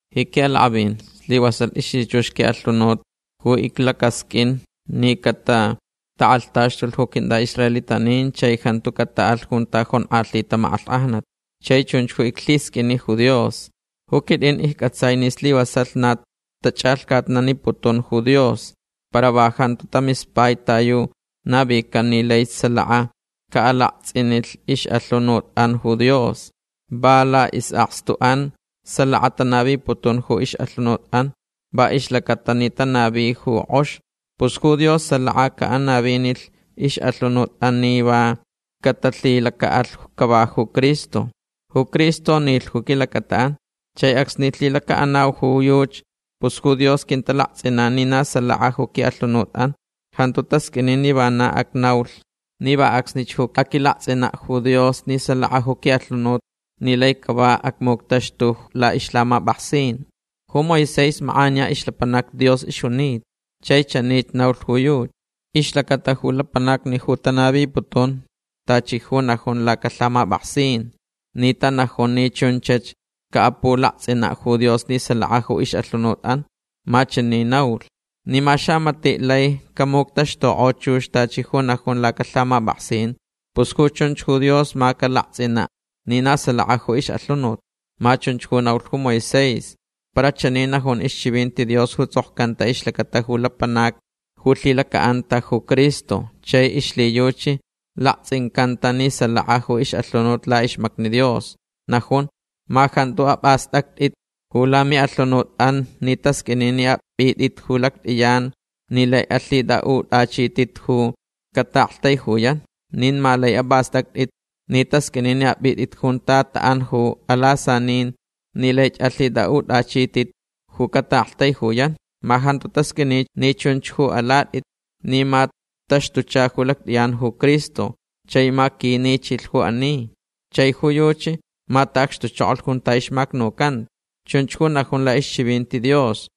Ji quiʼalakʼavin slivasalh ixlhichux quiʼalhunut ju iclacasqʼuin ni catatakʼalhtaxtulh ju quintʼaʼisraelitanin chai jantu cataʼalh junta jonkʼalhita makʼalhkʼajnat. Chai chunch ju iclhisqʼuini ju Dios. Ju quitʼin iccʼatsai ni slivasalh na tachʼalhcatnaniputun ju Dios. Para va jantu tamispai ta yu navican ni laich salaka caʼalaktsʼinilh ixʼalhunutʼan ju Dios. Va laʼisʼakstuʼan salaka tanaviputun ju ixʼalhunutʼan va ixlacata ni tanavich ju kʼox. Pus ju Dios salaka caʼanavinilh ixʼalhunutʼan ni va catalhilacaʼalh cava ju Cristo. Ju Cristo nilh ju quilacataʼan. Chai acsni lhilacaʼanau ju yuchi pus ju Dios quintalaktsʼinan ni na salaka ju quiʼalhunutʼan. Jantu tasqʼuini ni vana acnaulh ni va acsnich ju aquilaktsʼinaʼ ju Dios ni salaka ju quiʼalhunut ni lai cava acmuctaxtulh laʼixlhamapʼaksin. Ju Moisés makʼaniya ixlapanac Dios ixjunita. Chai chanich naulh ju yuchi ixlacata ju lapanacni ju tanaviputun tachi ju najun lacalhamapʼaksin ni tanajun ni chunchach caʼapulaktsʼinaʼ ju Dios ni salaka ju ixʼalhunutʼan. Ma chani naulh: “Ni ma xamatiʼ lai camuctaxtukʼo chux tachi ju najun lacalhamapʼaksin pus ju chunch ju Dios ma calaktsʼinaʼ ni na salaka ju ixʼalhunut”. Ma chunch ju naulh ju Moisés. Para chani najun ixchivinti Dios ju tsʼokcanta ixlacata ju lapanac ju lhilacaʼanta ju Cristo chai ixlhiyuchi laktsʼincanta ni salaka ju ixʼalhunut laʼixmacni Dios. Najun: “Ma jantu apʼastʼactʼit ju lamiʼalhunutʼan ni tasqʼuini ni apʼitʼit ju lactʼiyan ni lai alhitʼaʼutʼachitʼit ju cataʼaktaijuyan. Nin ma laich apʼastʼactʼit ni tasqʼuini ni apʼitʼit junta taʼan ju alasanin ni laich alhitʼaʼutʼachitʼit ju cataʼaktaijuyan. Ma jantu tasqʼuini ni chunch ju alatʼit ni ma taxtucha ju lactʼiyan ju Cristo chai ma quinichilh ju ani. Chai ju yuchi ma taʼacxtuchokolh junta ixmacnucanta”. Chunch ju najun laʼixchivinti Dios.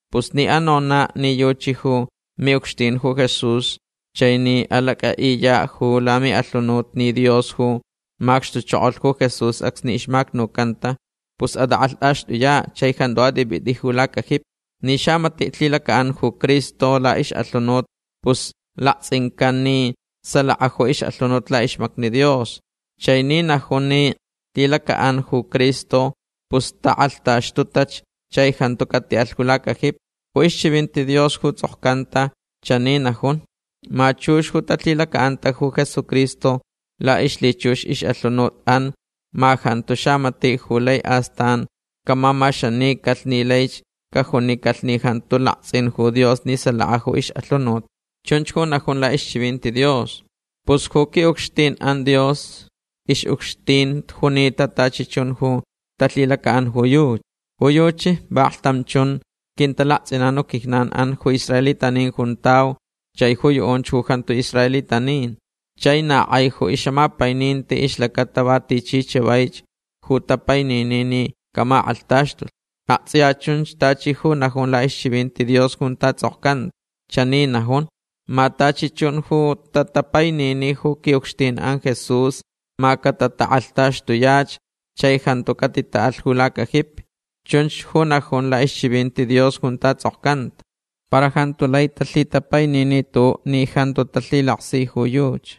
Pus ni anonaʼ ni yuchi ju miʼucxtin ju Jesús chai ni alacʼaʼiyaʼ ju lamiʼalhunut ni Dios ju macxtuchokolh ju Jesús acsni ixmacnucanta pus atʼakʼalhtʼaxtʼuyaʼ chai jantu atʼipʼitʼi ju lacajipi. Ni xamatiʼ lhilacaʼan ju Cristo laʼixʼalhunut pus laktsʼincan ni salaka ju ixʼalhunut laʼixmacni Dios. Chai ni najun ni lhilacaʼanch ju Cristo pus takʼalhtaxtutach chai jantu catiʼalh ju lacajipi. Ju ixchivinti Dios ju tsʼokcanta chani najun: “Ma chux ju talhilacaʼanta ju Jesucristo laʼixlhichux ixʼalhunutʼan ma jantu xamatiʼ ju lai astan camamaxanicalh ni laich cajunicalh ni jantu laktsʼin ju Dios ni salaka ju ixʼalhunut”. Chunch ju najun laʼixchivinti Dios. Pus ju quiʼucxtinʼan Dios ixʼucxtin junita tachi chun ju talhilacaʼan ju yuchi. Ju yuchi vaklhtam chun quintalaktsʼinan ju quijnanʼan ju israelitanin juntau chai ju yuʼunch ju jantu israelitanin. Chai na kʼai ju ixʼamapaininti ixlacata va tichi chavaich ju tapainini ni camakʼalhtaxtulh. Aktsʼiya chunch tachi ju najun laʼixchivinti Dios junta tsʼokcanta. Chani najun: “Ma tachi chun ju tatapainini ju quiʼucxtinʼan Jesús ma catatakʼalhtaxtuyach chai jantu catitaʼalh ju lacajipi”. Chunch ju najun laʼixchivinti Dios junta tsʼokcanta. Para jantu lai talhitapainini tuʼuʼ ni jantu talhilaksi ju yuchi.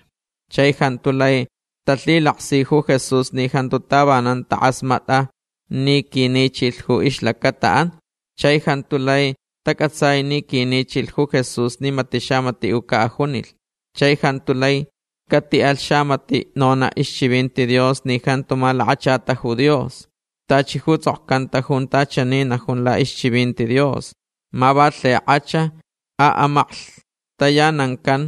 Chai jantu lai talhilaksi ju Jesús ni jantu tavanan takʼasmatʼa ni quinichilh ju ixlacataʼan. Chai jantu lai tacʼatsai ni quinichilh ju Jesús ni matiʼ xamatiʼ ju caʼajunilh. Chai jantu lai catiʼalh xamatiʼ nonaʼ ixchivinti Dios ni jantu malakachata ju Dios. Tachi ju tsʼokcanta junta chani najun laʼixchivinti Dios: “Ma va lhikʼach aʼamaklhtayanancan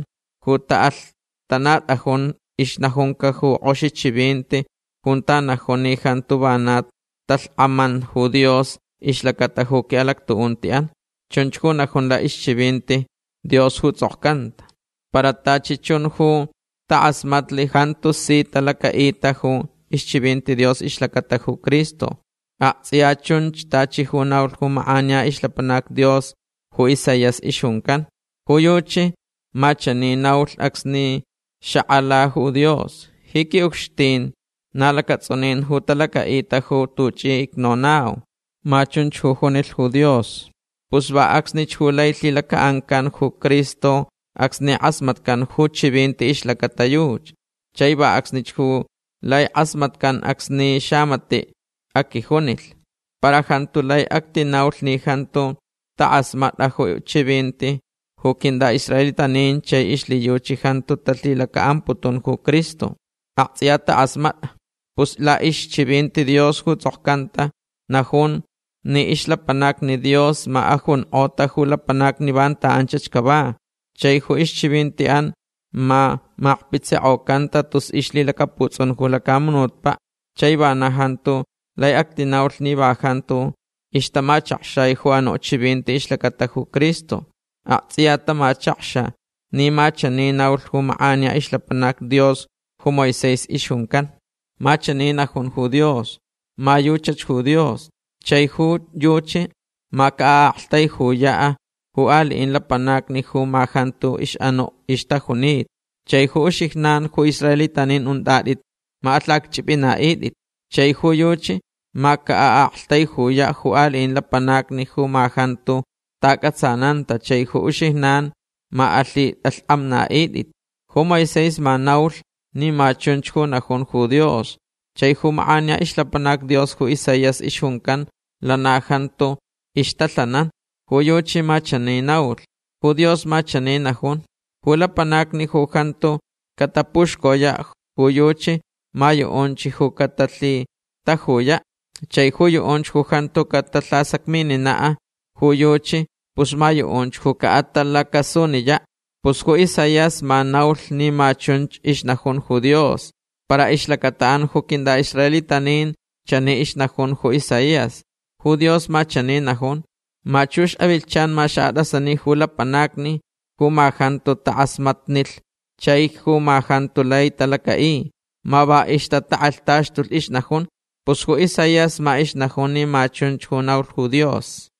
ju taʼalhtanatʼajun ixnajunca ju kʼoxi chivinti junta najun ni jantu vana talhkʼaman ju Dios ixlacata ju quiʼalactuʼuntiʼan”. Chunch ju najun laʼixchivinti Dios ju tsʼokcanta. Para tachi chun ju takʼasmatlh jantu si talacaʼita ju ixchivinti Dios ixlacata ju Cristo. Aktsʼiya chun tachi ju naulh ju makʼaniya ixlapanac Dios ju Isaías ixjuncan. Ju yuchi ma chani naulh acsni xakʼalalh ju Dios: “Ji quiʼucxtin na lacatsʼunin ju talacaʼita ju tuchi icnonauch”. Ma chunch ju junilh ju Dios. Pus va acsnich ju lai lhilacaʼancan ju Cristo acsni kʼasmatcan ju chivinti ixlacata yuchi. Chai va acsnich ju lai kʼasmatcan acsni va xamatiʼ aquijunilh. Para jantu lai actinaulh ni jantu takʼasmatʼach ju chivinti ju quintʼaʼisraelitanin chai ixlhiyuchi jantu talhilacaʼamputun ju Cristo. Aktsʼiya takʼasmatʼach. Pus laʼixchivinti Dios ju tsʼokcanta najun ni ixlapanacni Dios ma ajunkʼota ju lapanacni vanta anchach cava. Chai ju ixchivintiʼan ma makpitsikʼocanta tus ixlhilacaputsʼun ju lacamunutpaʼ. Chai vana jantu lai actinaulh ni va jantu ixtamachakxai ju anuʼ chivinti ixlacata ju Cristo. Aktsʼiya tamachakxa ni ma chani naulh ju makʼaniya ixlapanac Dios ju Moisés ixjuncan: Ma chani najun ju Dios: Ma yuchach ju Dios. Chai ju yuchi ma caʼaʼaktaijuyaʼ ju aliʼin lapanacni ju ma jantu ixʼanuʼ ixtajunita. Chai ju uxijnan ju israelitanin untʼatʼit ma alhacchʼipʼinaʼitʼit. Chai ju yuchi ma caʼaʼaktaijuyaʼ ju aliʼin lapanacni ju ma jantu taʼacʼatsananta chai ju uxijnan ma alhitʼalhkʼamnaʼitʼit. Ju Moisés ma naulh ni ma chunch ju najun ju Dios. Chai ju makʼaniya ixlapanac Dios ju Isaías ixjuncan lana jantu ixtalhanan. Ju yuchi ma chani naulh: Ju Dios ma chani najun: Ju lapanacni ju jantu catapuxcoyaʼ ju yuchi ma yuʼunch ju catalhitajuyaʼ. Chai ju yuʼunch ju jantu catalhasacmininaʼ ju yuchi pus ma yuʼunchach ju caʼatalacasuniyaʼ. Pus ju Isaías ma naulh ni ma chunch ixnajun ju Dios. Para ixlacataʼan ju quintʼaʼisraelitanin chani ixnajun ju Isaías: “Ju Dios ma chani najun: Ma chux avilhchan ma xaʼatʼasani ju lapanacni ju ma jantu takʼasmatnilh chai ju ma jantu lai talacaʼi. Ma va ixtatakʼalhtaxtulh ixnajun”. Pus ju Isaías ma ixnajun ni ma chunch ju naulh ju Dios.